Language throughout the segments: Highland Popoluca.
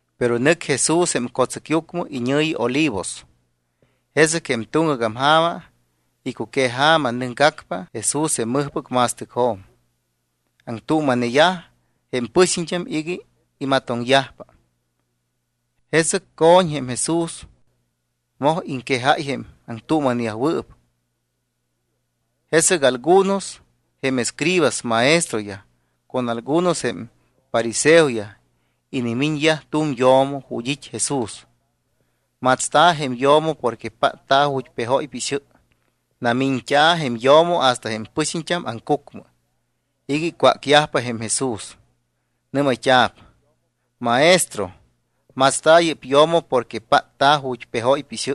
Pero nɨc Jesús jém co̱tsɨcyucmɨ iñɨ̱yi Olivos. Jesɨc jém tuŋgac ja̱ma, icuqueja̱ma, nɨcgacpa Jesús jém mɨjpɨc ma̱stɨcjo̱m. Aŋtuuma̱yaj jém pɨxiñt́am iga imatoŋyajpa. Jesɨc co̱ñ jém Jesús, moj iŋquejáy jém aŋtuuma̱neyajwɨɨp. Jesɨc algunos jém escribaspɨc maestroyaj con algunos jém fariseoyaj inimiñyaj tu̱m yo̱mo ju̱t́ it́ Jesús. Matsta̱ jém yo̱mo porque pátta̱ ju̱t́ pejóypa ixɨ. Namiñt́a̱ jém yo̱mo hasta jém pɨxiñt́am aŋcucmɨ iga icwácyajpa jém Jesús. Nɨ́mayt́a̱p: —Maestro, matsta̱ yɨ́p yo̱mo porque pátta̱ ju̱t́ pejóypa ixɨ.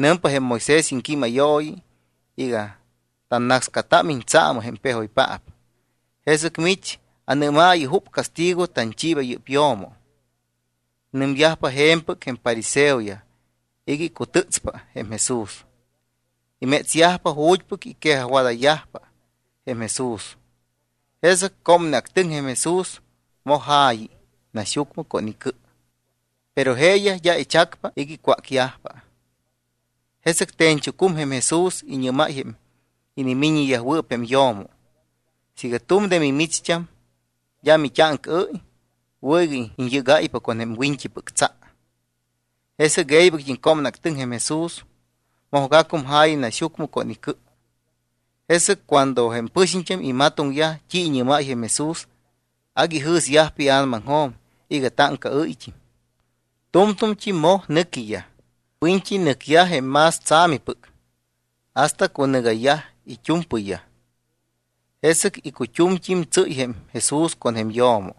Nɨmpa jém Moisés iŋquímayooyi iga tannácscatámiñ tsaamɨ jém pejoypaap. Jesɨc mich anɨ́maayɨ jup castigo tanchiiba yɨ́p yo̱mo. Nɨmyajpa je̱mpɨc jém fariseoyaj iga icutɨ́tspa jém Jesús. Imétsyajpa ju̱t́pɨc iquejajwadayyajpa jém Jesús. Jesɨc cómneactɨŋ jém Jesús, moj ja̱yi naxyucmɨ con icɨ. Pero jeeyaj d́a ichacpa iga icwácyajpa. Jesɨc te̱ñchucum jém Jesús, iñɨ́máy jém inimiññewɨɨp jém yo̱mo: —Siiga tu̱m de mimicht́am d́a mit́áŋcaɨ́y, wɨ̱ iga iñyɨ́gáypa con jém wiñt́ipɨc tsa. Jesɨc e̱ybɨct́im cómneactɨŋ jém Jesús, mojgacum ja̱yi naxyucmɨ con icɨ. Jesɨc cuando jém pɨxiñt́am imatoŋyaj t́i iñɨ́máy jém Jesús, agui ijɨ̱syajpa ia̱namaŋjo̱m iga táŋcaɨ́yt́im. Tu̱mtu̱mt́i moj nɨquiyaj. Wiñt́i nɨcyaj jém más tsa̱mipɨc hasta cunɨgayyaj it́u̱mpɨyyaj. Jesɨc icut́umt́im tsɨ́y jém Jesús con jém yo̱mo,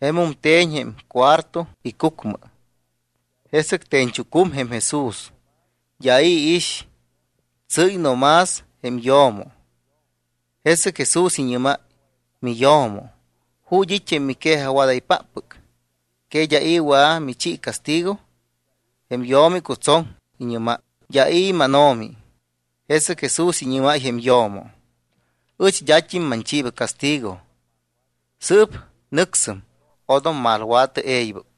jemum te̱ñ jém cuarto icucmɨ. Jesɨc te̱ñchucum jém Jesús. D́a i̱ iix, tsɨ́y no más jém yo̱mo. Jesɨc Jesús iñɨ́máy: —Miyo̱mo, ¿ju̱t́ it́ jém miquejajwádaypáppɨc? ¿Que d́a i̱ wɨa̱ michi castigo? Jém yo̱mo icutsoŋ. Iñɨ́máy: —D́a i̱, mánO̱mi. Jesɨc Jesús iñɨ́máy jém yo̱mo: —Ɨch d́at́im manchiiba castigo. Sɨɨp nɨcsɨm. Odom malwa̱tɨ e̱ybɨc.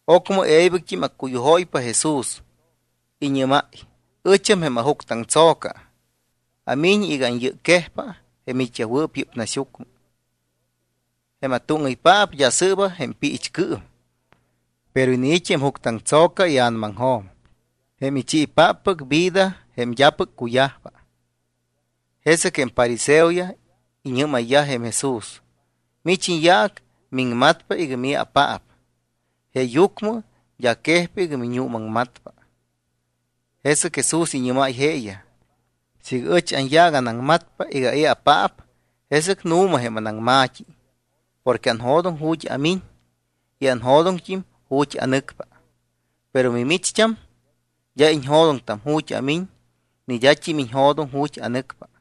Ocmɨ e̱ybɨct́im accuyujóypa Jesús, iñɨ́máy: —Ɨcham jém ajuctɨaŋtso̱ca, amiñ iga anyɨcquejpa jém it́yajwɨɨp yɨ́p naxyucmɨ. Jém atúŋɨypaap d́a sɨɨba jém piichcɨɨm, pero iniit́ jém juctɨ aŋtso̱ca ia̱namaŋjo̱m, jém ichiipáppɨc vida jém d́apɨc cuyajpa. Jesɨc jém fariseoyaj iñɨ́mayyaj jém Jesús: —Mich iñyaac miŋmatpa iga mii̱apaap, jeeyucmɨ d́a quejpa iga miñuumaŋmatpa. Jesɨc Jesús iñɨ́máy jeeyaj: —Siiga ɨch anyaac anaŋmatpa iga ai̱apaap, jesɨc nu̱ma jém anaŋma̱t́i porque anjo̱doŋ ju̱t́ amiñ y anjo̱doŋt́im ju̱t́ anɨcpa. Pero mimicht́am d́a iñjo̱doŋtam ju̱t́ amiñ ni d́at́im iñjo̱doŋ ju̱t́ anɨcpa.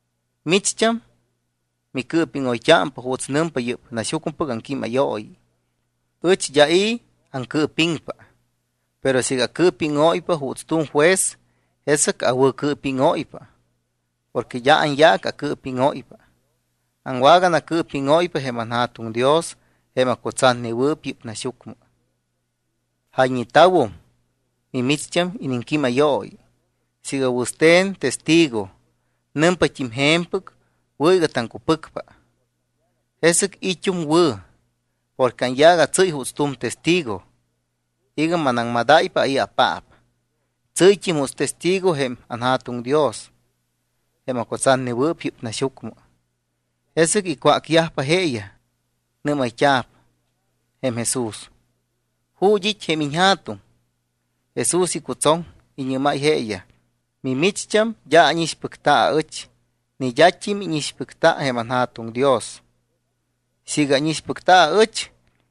Micht́am micɨɨpiŋoyt́ámpa juuts nɨmpa yɨ́p naxyucmɨpɨc aŋquímayooyi. Ɨch d́a i̱ aŋcɨɨpiŋpa. Pero siiga acɨɨpíŋóypa juuts tu̱m juez, jesɨc awɨ̱cɨɨpíŋóypa porque d́a anyaac acɨɨpíŋóypa. Aŋwaganacɨɨpíŋóypa jém anJa̱tuŋ Dios jém acutsatnewɨɨp yɨ́p naxyucmɨ. Jayñeta̱wum micht́ampɨc iniŋquímayooyi: “Siiga wɨste̱n testigo nɨmpat́im je̱mpɨc, wɨ̱ iga taŋcupɨcpa.” Jesɨc it́um wɨ̱ porque anyaac atsɨ́y juuts tu̱m testigo iga manaŋmadáypa ai̱apaap. Tsɨ́yt́im juuts testigo jém anJa̱tuŋ Dios, jém acutsatnewɨɨp yɨ́p naxyucmɨ. Jesɨc icwácyajpa jeeyaj. Nɨ́mayt́a̱p jém Jesús: —¿Ju̱t́ it́ jém iñJa̱tuŋ? Jesús icutsoŋ, iñɨ́máy jeeyaj: —Mimicht́am d́a ánixpɨcta aɨch ni d́at́im íñixpɨcta jém anJa̱tuŋ Dios. Siiga ánixpɨcta aɨch,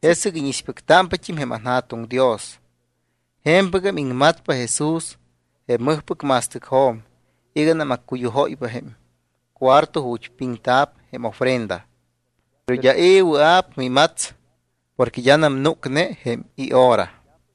jesɨc íñixpɨctámpat́im jém anJa̱tuŋ Dios. Je̱mpɨgam iŋmatpa Jesús jém mɨjpɨc ma̱stɨcjo̱m iganam accuyujóypa jém cuarto ju̱t́ piŋta̱p jém ofrenda. Pero d́a i̱ wɨa̱p imats porque d́anam núcne jém ihora.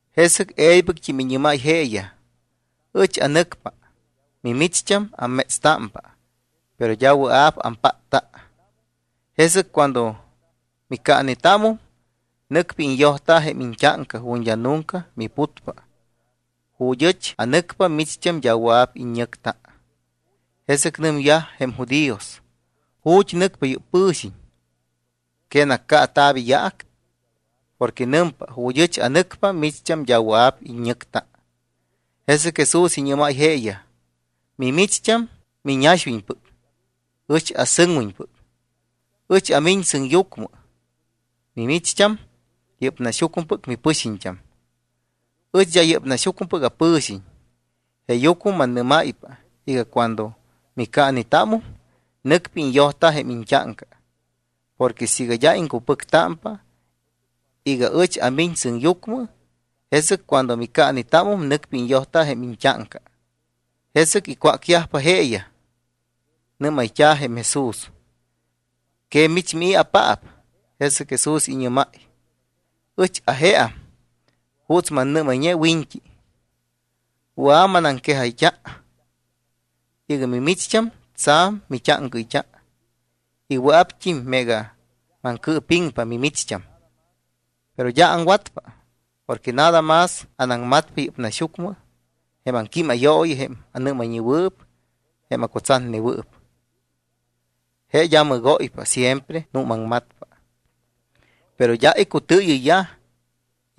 Jesɨc e̱ybɨct́im iñɨ́máy jeeyaj: —Ɨch anɨcpa. Mimicht́am ammétstámpa, pero d́a wɨa̱p ampátta. Jesɨc cuando micaanetámum, nɨcpa iñyojta jém iñt́áŋca ju̱t́ d́a nunca miputpa. Ju̱t́ ɨch anɨcpa, mimicht́am d́a wɨa̱p iññɨcta. Jesɨc nɨmyajpa jém judíos: —¿Ju̱t́ nɨcpa yɨ́p pɨ̱xiñ? ¿Que nacaata̱p iyaac? Porque nɨmpa: “Ju̱t́ ɨch anɨcpa, micht́am d́a wɨa̱p iññɨcta.” Jesɨc Jesús iñɨ́máy jeeyaj: —Mimicht́am miñaxwiñpɨc, ɨch asɨŋwiñpɨc, ɨch amiñ sɨŋyucmɨ. Mimicht́am yɨ́p naxyucmɨpɨc mipɨxiñt́am, ɨch d́a yɨ́p naxyucmɨpɨc apɨ̱xiñ. Jeeyucmɨ mannɨ́máypa iga cuando micaanetámum, nɨcpa iñyojta jém iñt́áŋca. Porque siiga d́a iŋcupɨctámpa iga ɨch amiñ sɨŋyucmɨ, jesɨc cuando micaanetámum, nɨcpa iñyojta jém iñt́áŋca. Jesɨc icwácyajpa jeeyaj, nɨ́mayt́a̱ jém Jesús: —¿Que mich mii̱apaap? Jesɨc Jesús iñɨ́máy: —Ɨch ajeam juuts mannɨ́mayñe wiñt́i. Wɨa̱ manaŋquejayt́a iga mimicht́am tsa̱m mit́áŋcaɨyt́a y wɨa̱pt́im meega maŋcɨɨpiŋpa mimicht́am. Pero d́a aŋwatpa, porque nada más anaŋmatpa yɨ́p naxyucmɨ jém aŋquímayooyi jém anɨ́mayñewɨɨp jém acutsatnewɨɨp. Je d́a mɨgóypa, siempre nuumaŋmatpa. Pero d́a icutɨɨyɨyyaj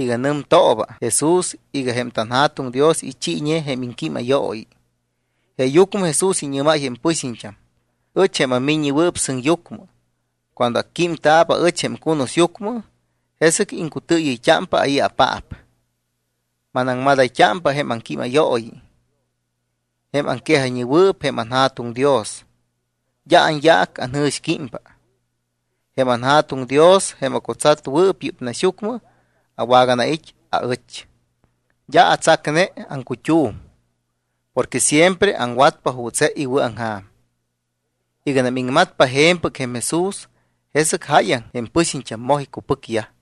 iga nɨmtooba Jesús iga jém tanJa̱tuŋ Dios ichiiñe jém iŋquímayooyi. Jeeyucmɨ Jesús iñɨ́máy jém pɨxiñt́am: —Ɨch jém aMiññewɨɨp Sɨŋyucmɨ y cuando acquímta̱p aɨch jém cunusyucmɨ, jesɨc iŋcutɨɨyɨyt́ámpa ai̱apaap. Manaŋmadayt́ámpa jém aŋquímayooyi jém aŋquejayñewɨɨp jém anJa̱tuŋ Dios. D́a anyaac anjɨ̱xquímpa. Jém anJa̱tuŋ Dios jém acutsatnewɨɨp yɨ́p naxyucmɨ, aŋwaganait́ aɨch. D́a atsacne aŋcut́um porque siempre aŋwatpa juuts je iwɨ̱aŋja̱m. Iganam iŋmatpa je̱mpɨc jém Jesús, jesɨc jáyaŋ jém pɨxiñt́am moj icupɨcyaj.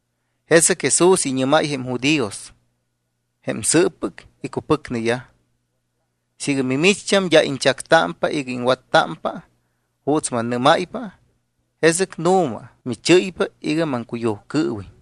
Jesɨc Jesús iñɨ́máy jém judíos jém sɨɨppɨc icupɨcneyaj: —Siiga mimicht́am d́a iñchactámpa iga iŋwattámpa juuts mannɨ́máypa, jesɨc nu̱ma michɨ́ypa iga maŋcuyujcɨɨwiñ.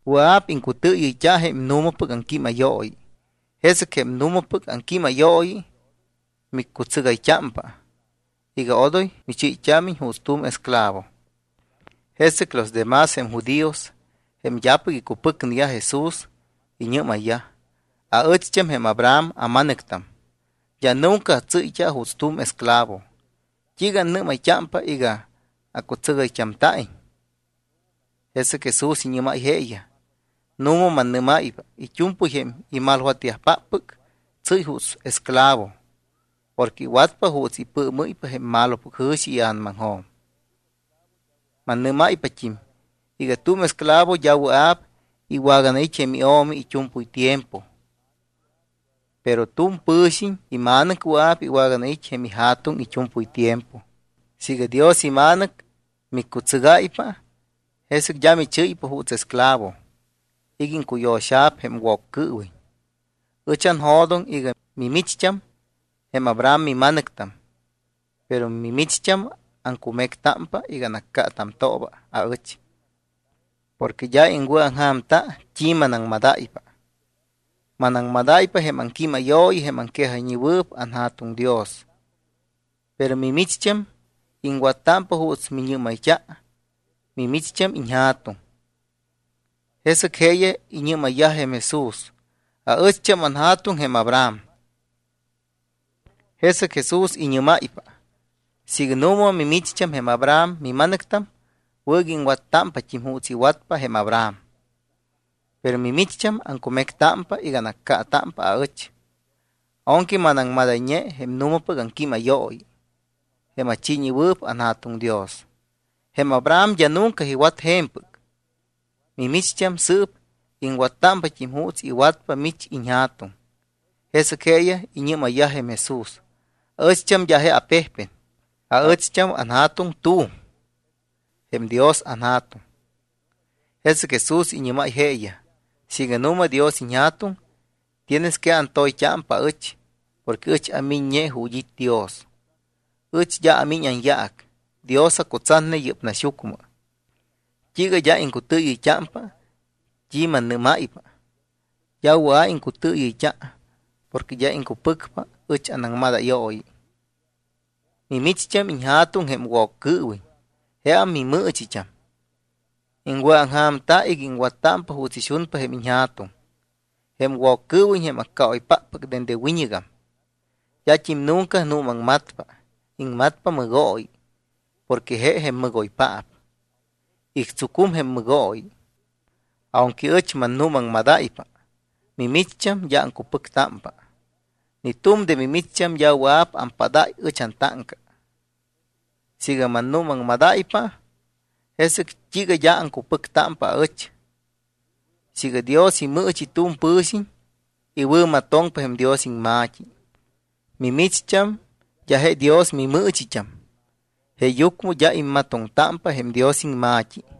Wɨa̱p iŋcutɨɨyɨyt́a jém nu̱mapɨc aŋquímayooyi, jesɨc jém nu̱mapɨc aŋquímayooyi miccutsɨgayt́ámpa iga odoy michɨ́yt́ámiñ juuts tu̱m esclavo. Jesɨc los de más jém judíos, jém d́apɨc icupɨcneyaj Jesús, iñɨ́mayyaj: —Aɨcht́am jém Abraham ama̱nɨctam. D́a nunca atsɨ́yt́a juuts tu̱m esclavo. ¿T́iiga annɨ́mayt́ámpa iga acutsɨgayt́amta̱iñ? Jesɨc Jesús iñɨ́máy jeeyaj: —Nu̱ma mannɨ́máypa, it́u̱mpɨy jém imalwatyajpáppɨc tsɨ́y juuts esclavo porque iwatpa juuts ipɨɨmɨ́ypa jém malopɨc jɨ̱xi ia̱namaŋjo̱m. Mannɨ́máypat́im iga tu̱m esclavo d́a wɨa̱p iwaganait́ jém io̱mi it́u̱mpɨy tiempo. Pero tu̱m pɨ̱xiñ ima̱nɨc wɨa̱p iwaganait́ jém ija̱tuŋ it́u̱mpɨy tiempo. Siiga Dios iMa̱nɨc miccutsɨgáypa, jesɨc d́a michɨ́ypa juuts esclavo iga iŋcuyo̱xa̱p jém Woccɨɨwiñ. Ɨch anjo̱doŋ iga mimicht́am jém Abraham mima̱nɨctam, pero mimicht́am aŋcumectámpa iga anaccaatamtooba aɨch porque d́a iŋwɨ̱aŋja̱mta t́i manaŋmadáypa. Manaŋmadáypa jém aŋquímayooyi jém aŋquejayñewɨɨp anJa̱tuŋ Dios. Pero mimicht́am iŋwattámpa juuts miñɨ́mayt́a mimicht́am iñja̱tuŋ. Jesɨc jeeyaj iñɨ́mayyaj jém Jesús: —Aɨcht́am anja̱tuŋ jém Abraham. Jesɨc Jesús iñɨ́máypa: —Siiga nu̱ma mimicht́am jém Abraham mima̱nɨctam, wɨ̱ iga iŋwattámpat́im juuts iwatpa jém Abraham. Pero mimicht́am aŋcumectámpa iga anaccaatámpa aɨch, aunque manaŋmadayñe jém nu̱mapɨc iŋquímayooyi jém achiiñewɨɨp anJa̱tuŋ Dios. Jém Abraham d́a nunca iwat je̱mpɨc. Micht́am, sɨɨp iŋwattámpat́im juuts iwatpa mich iñja̱tuŋ. Jesɨc jeeyaj iñɨ́mayyaj jém Jesús: —Aɨcht́am d́a je apejpen. Aɨcht́am anJa̱tuŋ t́u̱m, jém Dios anJa̱tuŋ. Jesɨc Jesús iñɨ́máy jeeyaj: —Siiga nu̱ma Dios iñJa̱tuŋ, tienes que antoyt́ámpa aɨch porque ɨch amiññe ju̱t́ it́ Dios. Ɨch d́a amiñ anyaac; Dios acutsatne yɨ́p naxyucmɨ. ¿T́iiga d́a iŋcutɨɨyɨyt́ámpa t́i mannɨ́máypa? D́a wɨa̱p iŋcutɨɨyɨyt́a porque d́a iŋcupɨcpa ɨch anaŋmadayooyi. Mimicht́am iñja̱tuŋ jém Woccɨɨwiñ. Jeam mimɨɨchit́am. Iŋwɨ̱aŋja̱mta iga iŋwattámpa juuts ixunpa jém iñja̱tuŋ. Jém Woccɨɨwiñ jém accaoypáppɨc dende wiñɨgam. D́at́im nunca nuumaŋmatpa. Iŋmatpa mɨgooyi porque je jém mɨgoypaap, ictsucum jém mɨgooyi. Aunque ɨch mannuumaŋmadáypa, mimicht́am d́a aŋcupɨctámpa. Ni tu̱m de mimicht́am d́a wɨa̱p ampádáy ɨch antáŋca. Siiga mannuumaŋmatpa, ¿jesɨc t́iiga d́a aŋcupɨctámpa aɨch? Siiga Dios imɨɨchi tu̱m pɨ̱xiñ, iwɨ̱matoŋpa jém Dios iŋma̱t́i. Mimicht́am d́a je Dios mimɨɨchit́am jeeyucmɨ d́a immatoŋtámpa jém Dios iŋma̱t́i.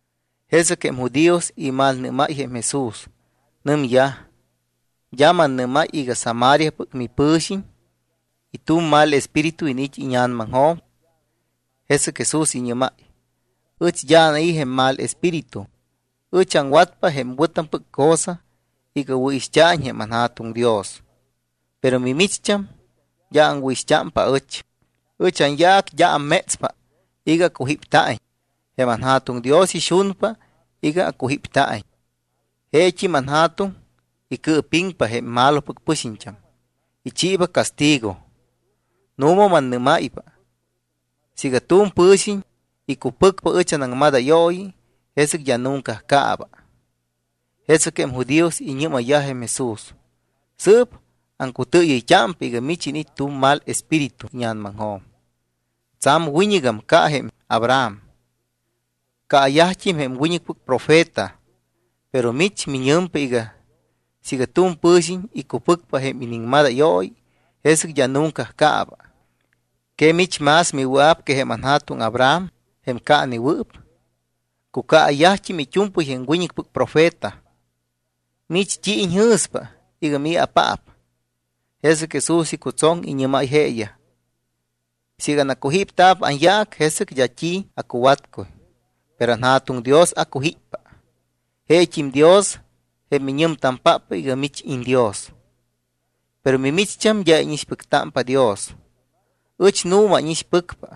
Jesɨc jém judíos imalnɨ́máy jém Jesús, nɨmyaj: —¿D́a mannɨ́máy iga Samariapɨc mipɨ̱xiñ y tu̱m mal espíritu iniit́ íña̱namaŋjo̱m? Jesɨc Jesús iñɨ́máy: —Ɨch d́a anai̱ jém mal espíritu. Ɨch aŋwatpa jém wɨ̱tampɨc cosa iga wɨ̱ixt́a̱iñ jém anJa̱tuŋ Dios. Pero mimicht́am d́a aŋwɨ̱ixt́ámpa aɨch. Ɨch anyaac d́a ammétspa iga acujípta̱iñ. Jém anJa̱tuŋ Dios ixunpa iga acujípta̱iñ. Jeet́im anJa̱tuŋ icɨɨpiŋpa jém malopɨc pɨxiñt́am, ichiiba castigo. Nu̱ma mannɨ́máypa, siiga tu̱m pɨ̱xiñ icupɨcpa ɨch anaŋmadayooyi, jesɨc d́a nunca caaba. Jesɨc jém judíos iñɨ́mayyaj jém Jesús: —Sɨɨp aŋcutɨɨyɨyt́ámpa iga mich iniit́ tu̱m mal espíritu íña̱namaŋjo̱m. Tsa̱m wiñɨgam ca jém Abraham. Caayajt́im jém wiñɨcpɨc profeta, pero mich miñɨmpa iga siiga tu̱m pɨ̱xiñ icupɨcpa jém iniŋmadayooyi, jesɨc d́a nunca caaba. ¿Que mich más miwɨa̱p que jém anja̱tuŋ Abraham jém caanewɨɨp? Cucaayyajt́im it́u̱mpɨy jém wiñɨcpɨc profeta. ¿Mich t́i iñjɨ̱spa iga mii̱apaap? Jesɨc Jesús icutsoŋ, iñɨ́máy jeeyaj: —Siiga anacujípta̱p anyaac, jesɨc d́a t́i acuwatcuy. Pero anJa̱tuŋ Dios acujíppa. Jeet́im Dios, jém miñɨmtampáppɨc iga mich iñDios. Pero mimicht́am d́a íñixpɨctámpa Dios. Ɨch nu̱ma ánixpɨcpa.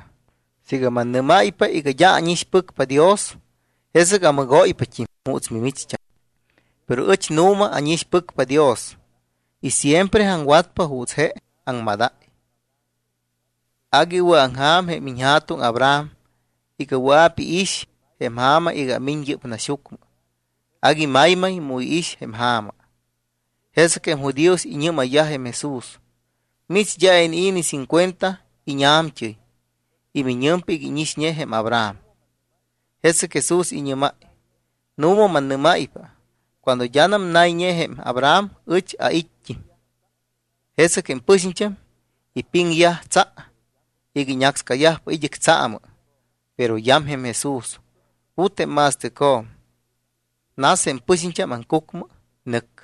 Siiga mannɨ́máypa iga d́a ánixpɨcpa Dios, jesɨc amɨgóypat́im juuts mimicht́am. Pero ɨch nu̱ma ánixpɨcpa Dios y siempre aŋwatpa juuts je aŋmadáy. Agui iwɨ̱aŋja̱m jém iñja̱tuŋ Abraham iga wɨa̱p iix jém ja̱ma iga amiñ yɨ́p naxyucmɨ, agui maymay mu iix jém ja̱ma. Jesɨc jém judíos iñɨ́mayyaj jém Jesús: —Mich d́a inii̱ ni cincuenta íña̱mt́ɨy ¿y miñɨmpa iga íñixñe jém Abraham? Jesɨc Jesús iñɨ́máy: —Nu̱ma mannɨ́máypa cuando d́anam nayñe jém Abraham, ɨch ait́t́im. Jesɨc jém pɨxiñt́am ipiŋyaj tsa iga iñácscayajpa id́ɨc tsaamɨ. Pero yam jém Jesús, put jém ma̱stɨcjo̱m, nas jém pɨxiñt́am aŋcucmɨ. Nɨc.